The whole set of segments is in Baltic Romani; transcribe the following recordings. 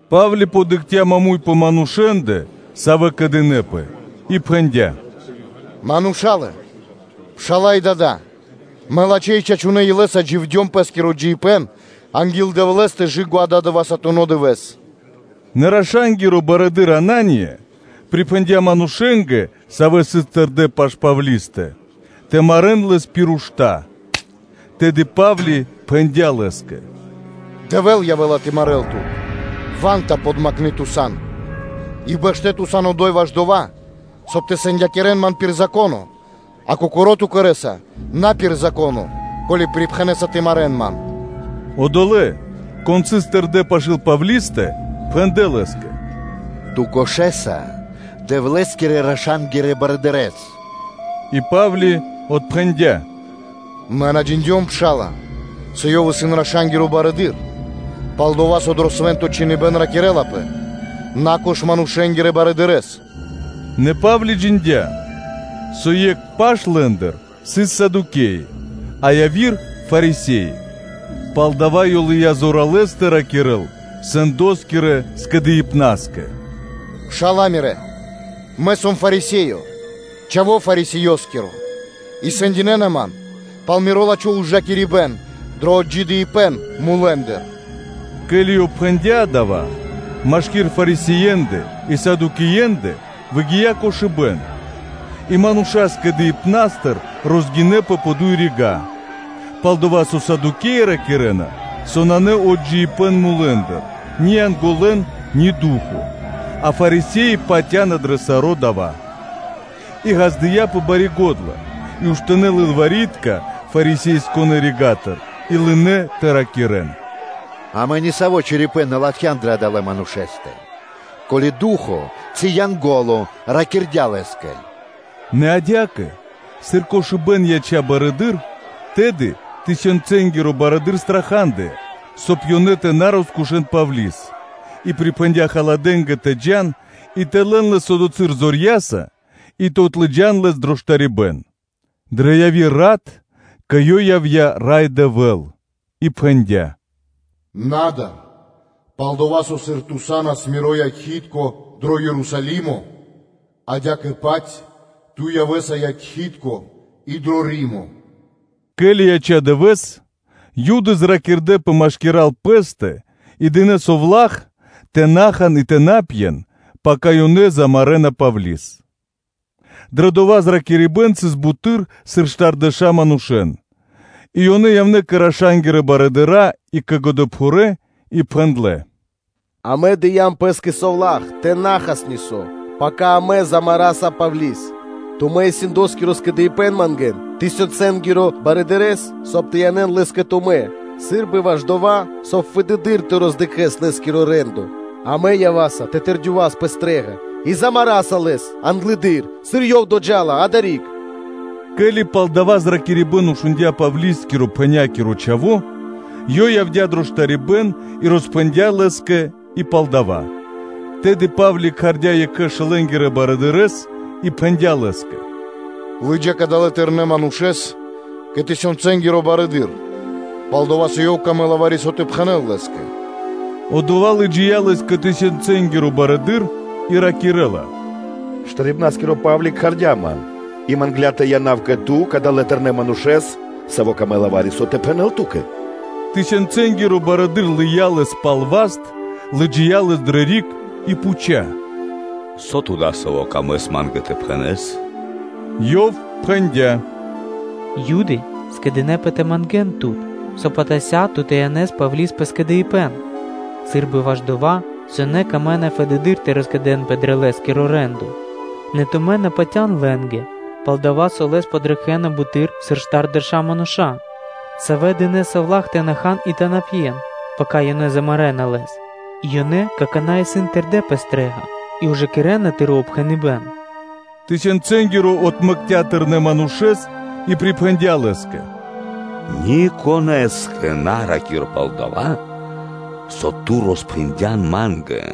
Па́вли дыкхця маму́й пэ манушэ́ндэ, савэ́ кэдынэпэ, и пхэндя́: “Мурша́лэ, пшала́лэ, дадолэ! Мэ лачхэ́ и чачунэ́ илэ́са дживдём пэ́скиро джиибэ́н анги́л Дэвлэ́стэ кэ/жы́ко ададывэсатуно дывэ́с.” Нэ раша́нгиро барыдыро́ Анания припхэндя́ манушэ́нгэ, савэ́ сыс тэрдэ́ пашы́л Павлистэ тэ марэ́н лэс пир ушта́. Тэды Па́вли пхэндя́ лэ́скэ: “Дэвэ́л явэ́ла тэ марэл тут, ва́нта подмакны ту сан! И бэшто́ ту сан одо́й, ваш дова́, соб (кай) тэ сэндякирэс ман пир Зако́но, а кокоро́ ту кэрэ́са на пир Зако́но, ко́ли припхэнэса тэ марэ́н ман?” Одолэ́, кон сыс тэрдо́ пашы́л Павлистэ, пхэндлэ́ лэ́скэ: “Ту кошэса Дэвлэ́скирэ-раша́нгирэ барыдырэ́с.” И Па́вли отпхэндя́: “Мэ на джиндём, пшала́лэ, со ёв исын раша́нгиро барыдыро́, пал-дова́ со дро Свэ́нто Чхиныбэ́н ракирэлапэ: ‘На кош манушэ́нгирэ барыдырэ́с.’” Нэ Па́вли джиндя́, со екх паш лэ́ндыр сыс Садукеи, а яви́р паш Фарисе́и, палдава́ ёв лыя́ зоралэ́с тэ ракирэ́л Синедрионоскэ (сэндоскирэ скэдыибнаскэ): “Пшала́лэ мирэ́! Мэ сом Фарисеё, чхаво́ Фарисеёскиро; и сэндинэна ман пал миро лачхо́ ужакирибэ́н дро отджидыибэн мулэ́ндыр.” Ке́ли ёв пхэндя́ дава́, машки́р Фарисеендэ и Садукеендэ выгия́ кошыбэ́н, и мануша́ Скэдыибнастыр розгинэпэ пэ дуй рига́. Пал-дова́ со Садукеи ракирэ́на, со нанэ отджидыибэн мулэ́ндыр, ни Янголэн, ни ду́хо (фа́но); а Фарисе́и патя́на дрэ саро́ дава́. И ґаздыя́пэ бари го́дла, и уштынэ́ лылвари́тка Фарисее́нгирэ рига́тыр и лынэ́ тэ ракирэ́н: “Амэ нисаво́ чорипэ́н на латхям дрэ адалэ́ манушэ́стэ; ко́ли ду́хо (фа́но) ци Янго́ло ракирдя́ лэ́скэ?” Нэ адя́кэ, сыр кошыбэ́н яця́ барэды́р, тэды тысёнцэнгиро барыдыро́ страхадыя, соб (кай) ёнэ тэ на роскушэн Павли́с, и припхэндя́ халадэнгэ тэ джа́н и тэ лэн лэс одотхы́р зорья́са и тэ отлыджан дро штарибэ́н. Дрэ яви́р рат кэ ёв явдя́ Рай Дэвэ́л и пхэндя́: “Яв муршкано́; пал-дова́ со сыр ту са́нас Миро якхи́тко дро Ерусалимо, адя́кэ-паць ту явэ́са якхи́тко и дро Римо.” Ке́ли яця́ дывэ́с, Юды зракирдэпэ машкира́л пэ́стэ и дынэ́ совла́х, тэ на хан и тэ на пьен, пака ёнэ замарэна Павли́с. Дро дава́ зракирибэ́н сыс буты́р, сыр штардэша́ мануша́; и ёнэ явнэ́ кэ раша́нгирэ барыдыра́ и кэ годэпхурэ́ и пхэндлэ́: “Амэ дыям пэ́скэ совла́х тэ на хас нисо́, пака амэ замараса Павли́с. Тумэ́ и сэндоскиро скэдыибэ́н мангэ́н тысёнцэнгиро барыдырэ́с, соб (кай) тэ янэ́н лэс кэ тумэ́, сы́рбы ваш дова́, соб (кай) фэдэды́р тэ роздыкхэс лэ́скиро рэ́ндо, а мэ ява́са тэ тэрдёвас пэ стрэ́га и да́са муло́ (мулякираса) лэс англэды́р, сыр ёв доджа́ла адари́к.” Ке́ли пал дава́ зракирибэ́н шундя́ Павлискирэ – пхэнякиро чхаво́, ёв явдя́ дро штарибэ́н и роспхэндя́ лэ́скэ и пал дава́. Тэды Па́вли кхардя́ екхэ шэлэнгирэ барыдырэ́с и пхэндя́ лэ́скэ: “Лы́джа кадалэс тэрнэ́ манушэ́с кэ тысёнцэнгиро барыдыро́, пал-дова́ со ёв камэ́ла вари-со тэ пхэнэ́л лэ́скэ.” Одова́ лыджия́ лэс кэ тысенцэнгиро барыдыро́ и ракирэ́ла: “Штарибнаскиро Па́вли, кхардя́ ман и мангдя́ тэ янав кэ ту кадалэ́ тэрнэ́ манушэ́с, саво́ камэ́ла вари-со тэ пхэнэ́л ту́кэ.” Тысёнцэнгиро барыдыро́ лыя́ лэс пал васт, лыджия́ лэс дрэ риг и пхуця́: “Со ту дасаво камэ́са ма́нгэ тэ пхэнэ́с?” Ёв пхэндя́: “Юды скэдынэ́пэ тэ мангэ́н тут, соб (кай) атася́ ту тэ янэс Павли́с пэ скэдыибэ́н, сы́рбы ваш дова́, со ёнэ камэ́на фэдэды́р тэ роскэдэнпэ дрэ лэ́скиро рэ́ндо. Нэ тумэ́ на патя́н лэ́нгэ, пал-дова́ со лэс подракхэна буты́р, сыр штардэша́ мануша́, савэ́ дынэ́ совла́х тэ на хан и тэ на пьен, пака ёнэ замарэна лэс; и ёнэ какана́ исын тэрдэ́ пэ стрэ́га и ужакирэ́на тыро́ упхэныбэ́н.” Тысёнцэнгиро отмэкця́ тэрнэ́ манушэ́с, и припхэндя́ лэ́скэ: “Никонэ́скэ на ра́кир пал дава́, со ту роспхэндян ма́нгэ.”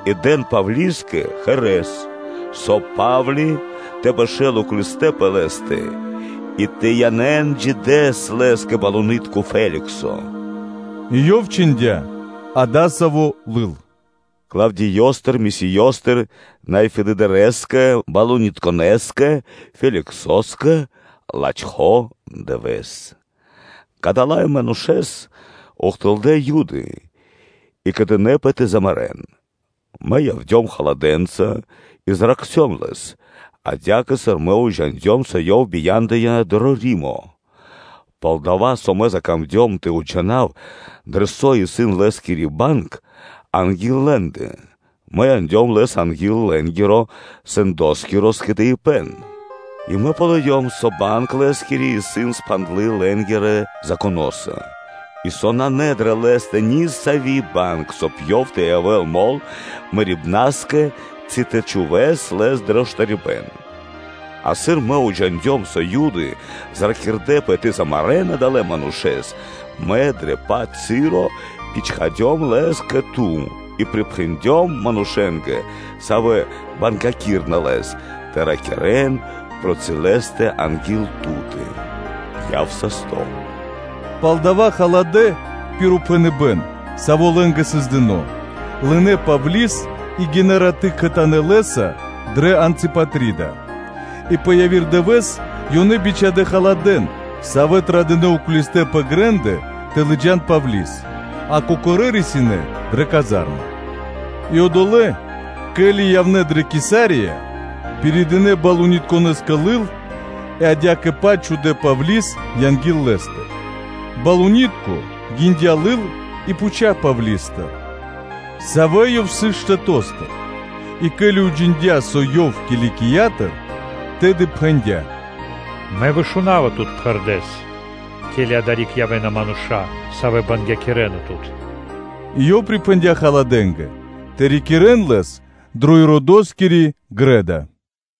И дэн Павлискэ осло́с, соб (кай) ёв тэ бэшэ́л уклисто/э пэ лэ́стэ и тэ янэ́н джидэс лэс кэ балунитко (правителё) Феликсо, И ёв чхиндя́ адасаво́ лыл: “Клавдиёстыр Лисиёстыр Най Фэдыдырэскэ балунитконэскэ Феликсоскэ, лачхо́ дывэ́с! Кадалэ́ манушэ́с ухтылдэ́ Юды и кэдынэпэ тэ мулякирэ́н; мэ явдём халадэнца и зракхцём лэс, адя́кэ сыр мэ уджиндём, со ёв бия́ндыя дро Римо. Пал-дова́ со мэ закамдём тэ уджинав, дрэ со исын лэ́скири банг анги́л лэ́ндэ, мэ яндём лэс анги́л лэ́нгиро сэндоскиро скэдыибэ́н; и мэ ґалыём, со банг лэ́скири исын спхандлы лэ́нгирэ Законоса, и со нанэ дрэ лэ́стэ нисави́ банг, соб (кай) ёв тэ явэ́л мол мэрибна́скэ ци тэ чхувэ́с лэс дро штарибэ́н. А сыр мэ уджиндём, со Юды зракирдэпэ тэ мулякирэ́н адалэ́ манушэ́с, мэ дрэ дова́-паць часо бичхадём лэс кэ ту и припхэндём манушэ́нгэ, савэ́ бангякирэна лэс, тэ ракирэ́н проти лэ́стэ анги́л ту́тэ. Яв састо́.” Палдава́ халадэ́ пир упхэныбэ́н, саво́ лэ́нгэ сыс дыно́, лынэ́ Павли́с и гинэ́ раты́ кхэтанэ́ лэ́са дрэ Анципатрида, и пэ яви́р дывэ́с, ёнэ бичхадэ́ халадэ́н, савэ́ традынэ уклистэ́ пэ грэ́ндэ, тэ лыджа́н Павли́с, а кокорэ́ рисинэ́ дрэ казарма. И одолэ́, ке́ли явнэ́ дрэ Кесария, пиридынэ балунитконэскэ лыл и адя́кэ-паць чхудэ́ Павли́с анги́л лэ́стэ. Балунитко гиндя лыл и пхуця́ Павли́стыр, савэ́ ёв сыс штэто́стыр, и ке́ли ёв уджиндя́, со ёв сыс Киликиятыр, тэды пхэндя́: “Мэ вышунава тут пхэрдэ́с, ке́ли адари́к явэ́на мануша́, савэ́ бангякирэна тут.” И ёв припхэндя́ халадэнгэ тэ рикирэ́н лэс пэ Иродоскири грэ́да (дво́ро).